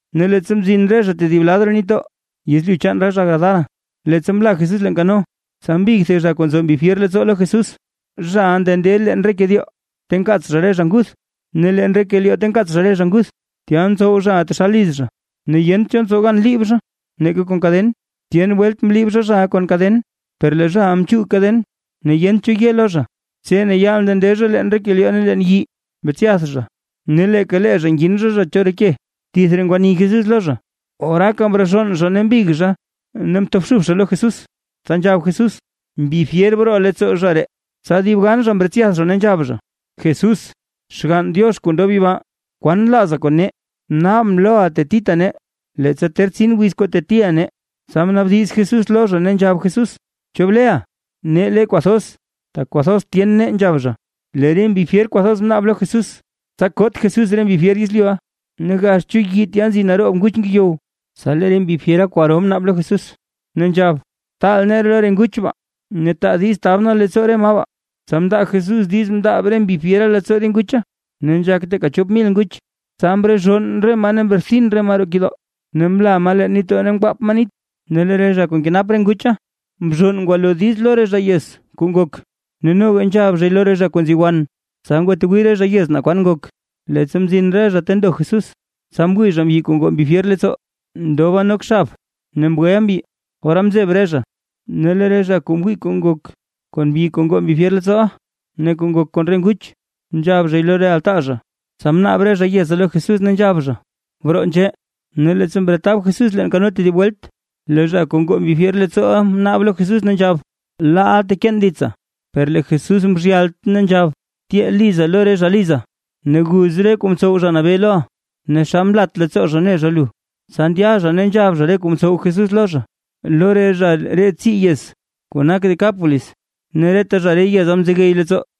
Ne leettsa mzin re zha tedib lad roo nitdoo yezlyu chaan re zha Gadara. Leettsa mla Jesús leen kano, tsa mbig thib zha kuu nzo mbi fyer leettsoo lo Jesús, zhaʼa ndende leen re kelyoo, ta nkaats zha re zha nguth. Ne leen re kelyoo ta nkaats zha re zha nguth, tya mtsow zhaʼa taxal liz zha. Ne yent cho ntsow gan liib zha neeka kon kaden. Tyen welt mliib zha zhaʼa kon kaden, per lee zhaʼa mchuug kaden ne yent cho nye lo zha. Tse ne yaal ndende zha leen re kelyoo ne leen yii, mbetsyath zha, ne leeka lee zha ngin zha zha cho re ke. Tith raa ngwani Jesús lo zha, oraaka mrezhonn zha mbig zha ne mtobxub zha lo Jesús. Tsa nzhab Jesús: ―Mbi fyer broo leettsoo zha ree. Tsa dib gan zha mretsyath zha ne nzhab zha: ―Jesús. ¡Xgann Diox kuu ndob yibaa! ¡Kwan nlaaza kon nee! Naabʼn loʼa tetita nee, leettsa ter tsin wiz kuu tetiʼa nee. Tsa mnaabdiz Jesús lo zha, ne nzhab Jesús: ―¿Cho bleʼa? ―Nee le kwathoz, tak kwathoz tyen nee ―nzhab zha. Lee re mbi fyer kwathoz mnaab lo Jesús, tsa koot Jesús re mbi fyera yezlyuʼa. Ne gax chu yii tya nzi naroob nguch ngeyow. Tsa lee re mbi fyera kwaro mnaab lo Jesús, ne nzhab: ―Taal nee lo re nguch baa, ne taa diiz tab nee leettsoo re maa baa. Tsa mndaa Jesús diiz mndaab re mbi fyera leettsoo re ngucha. Ne nzhak teeka chop mil nguch, tsa mrezhonn re maa ne mrethin maa roo kedoo, ne mla maa leen nitdoo ne ngwaap maa nit. Ne lee re zha kuu nkenap re ngucha, mzhonn ngwalo diiz lo re zha yez kuu ngok, ne noga nzhab zhay lo re zha kuu nzi wan. Tsa ngwatwii re zha yez naa kwan ngok. Leettsa mzin re zha ta ndo Jesús, tsa mwii zha mbyi kuu ngoo mbi fyer leettsoo, ndoba nok xab ne mgweʼa mbyi, ora mzeb re zha. Ne lee re zha kuu mwii kuu ngok kon mbyi kuu ngoo mbyi fyer leettsooʼa, ne kuu ngok kon re nguch, nzhab zhay lo re altaa zha. Tsa mnaab re zha yeza lo Jesús ne nzhab zha: ―Broo nzhee. Ne leettsa mretab Jesús leen kano tedib welt, lee zha kuu ngoo mbi fyer leettsooʼa, mnaab lo Jesús ne nzhab: ―Laaʼa teken ditsa. Per lee Jesús mzhyalt, ne nzhab: ―Tyee liza lo re zha liza, ne guz re kuu mtsow Zha Nabee loʼa, ne xa mlat leettsoo zha mne zha lu. Tsa ndya zha ne nzhab zha re kuu mtsow Jesús lo zha, lo re zha re tsii yez kuu nak Decápolis, ne reta zha re yeza mzegey leettsoo.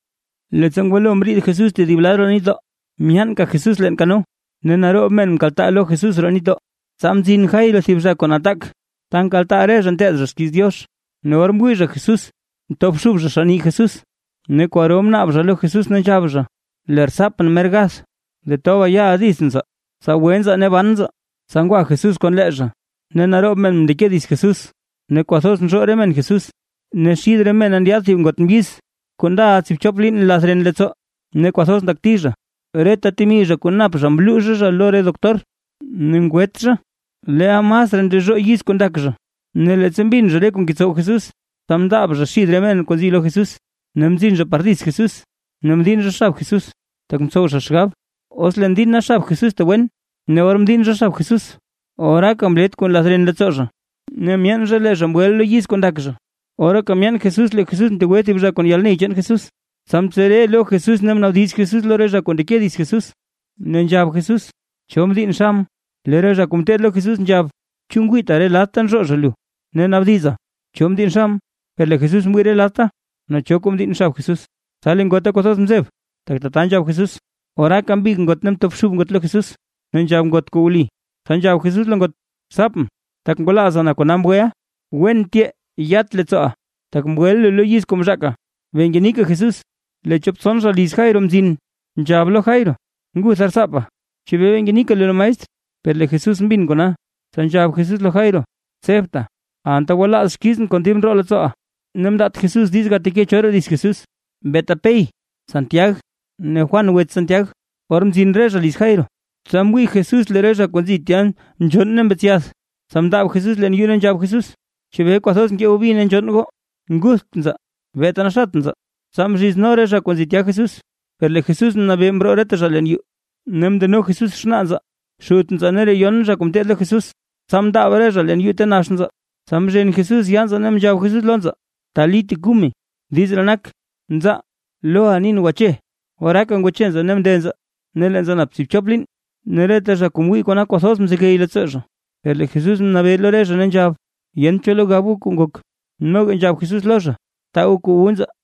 Leettsa ngwalo mriid Jesús tedib lad roo nitdoo, myaanka Jesús leen kano, ne naroob men mkaltaa lo Jesús roo nitdoo. Tsa mzin Jairo thib zha kuu nataak ta nkaltaa re zha kuu nteed xkiiz Diox, ne or mwii zha Jesús, mtobxub zha xann nii Jesús, ne kwaro mnaab zha lo Jesús, ne nzhab zha: ―Lee rtsaapʼn mer gath. De toba yaaʼa dits nzaa, tsa gwe nzaa ne ban nzaa. Tsa ngwa Jesús kon lee zha, ne naroob men mndeke dits Jesús, ne kwathoz nzhoo re men Jesús. Ne xid re mena ndyaad thib ngot mbyiz, kuu ndaʼa tsiibchop liin nlath ren leettsoo, ne kwathoz ndakti zha, reta temi zha kuu nap zha mluuzha zha lo re doctor, ne ngwet zha, leel masraa mndezhoo yiz kuu ndak zha. Ne leettsa mbin zha re kuu ngetsow Jesús, tsa mndaab zha xid re men kuu nzi lo Jesús, ne mzin zha par dits Jesús ne mdiinn zha xab Jesús. Tak mtsow zha xgab: “Os leen diinn na xab Jesús, tegwen”. Ne or mdiinn zha xab Jesús, oraaka mlet kuu nlath ren leettsoo zha, ne myeen zha lee zha mgweʼa lo yiz kuu ndak zha. Oraaka myeen Jesús lee Jesús mtegwe thib zha kon yalney chaan Jesús, tsa mtsere lo Jesús, ne mnaabdiz Jesús lo re zha kuu ndeke dits Jesús, ne nzhab Jesús: ―¿Cho mdiinn xabʼn? Lee re zha kuu ngeteed lo Jesús nzhab: ―¿Chu ngwiita re ladta nzhoo zha lu? Ne naabdiza: “¿Cho mdiinn xabʼn?” Per lee Jesús mwii re ladta, naa cho kuu mdiinn xab Jesús. Tsa lee ngota kwathoz mzeb, tak tata nzhab Jesús, oraaka mbig ngot ne mtobxub ngot lo Jesús, ne nzhab ngot kuu wli. Tsa nzhab Jesús lo ngot: ―Rtsaapʼn, tak ngwalaaza na kona mgweʼa. Wen tyee yat leettsooʼa, tak mgweʼa lu lo yiz kuu mzhaaka. Bee ngenika Jesús, lee chop tson zha liz Jairo mzin, nzhab lo Jairo: ―Ngutha rtsaapa. ¿Chebee ngenika lu lo maestr? Per lee Jesús mbin kona, tsa nzhab Jesús lo Jairo: ―Tsebta. Anta gwalaaz xkizʼn kon dib ndroo leettsooʼa. Ne mndaat Jesús diiz gateke choraa dits Jesús, beeta Pey, Santiag ne Juan wets Santiag. Or mzin re zha liz Jairo, tsa mwii Jesús lee re zha kuu nzi tya nzhonn ne mbetsyath. Tsa mndaab Jesús leen yuu, ne nzhab Jesús: ―¿Chebee kwathoz nkee goo bi ne nzhonn goo? Ngutht nzaa, beeta naxat nzaa. Tsa mzhizno re zha kuu nzi tya Jesús, per lee Jesús mnabee mroo reta zha leen yuu, ne mndeno Jesús xnaa nzaa, xut nzaa ne re yon zha kuu ngeteed lo Jesús, tsa mndaab re zha leen yuu ta nax nzaa. Tsa mzhen Jesús yaa nzaa ne nzhab Jesús lo nzaa: ―Talita kumi. (Diiz ree nak: “Nzaa, loʼa nin, ¡gwache!”) Oraaka ngwache nzaa ne mnde nzaa, ne lee nzaa nap tsiibchop liin. Ne reta zha kuu mwii kona kwathoz mzegey leettsoo zha. Per lee Jesús mnabee lo re zha, ne nzhab: ―Yent cho lo gab goo kuu ngok. Noga nzhab Jesús lo zha: ―Taa goo kuu wu nzaa.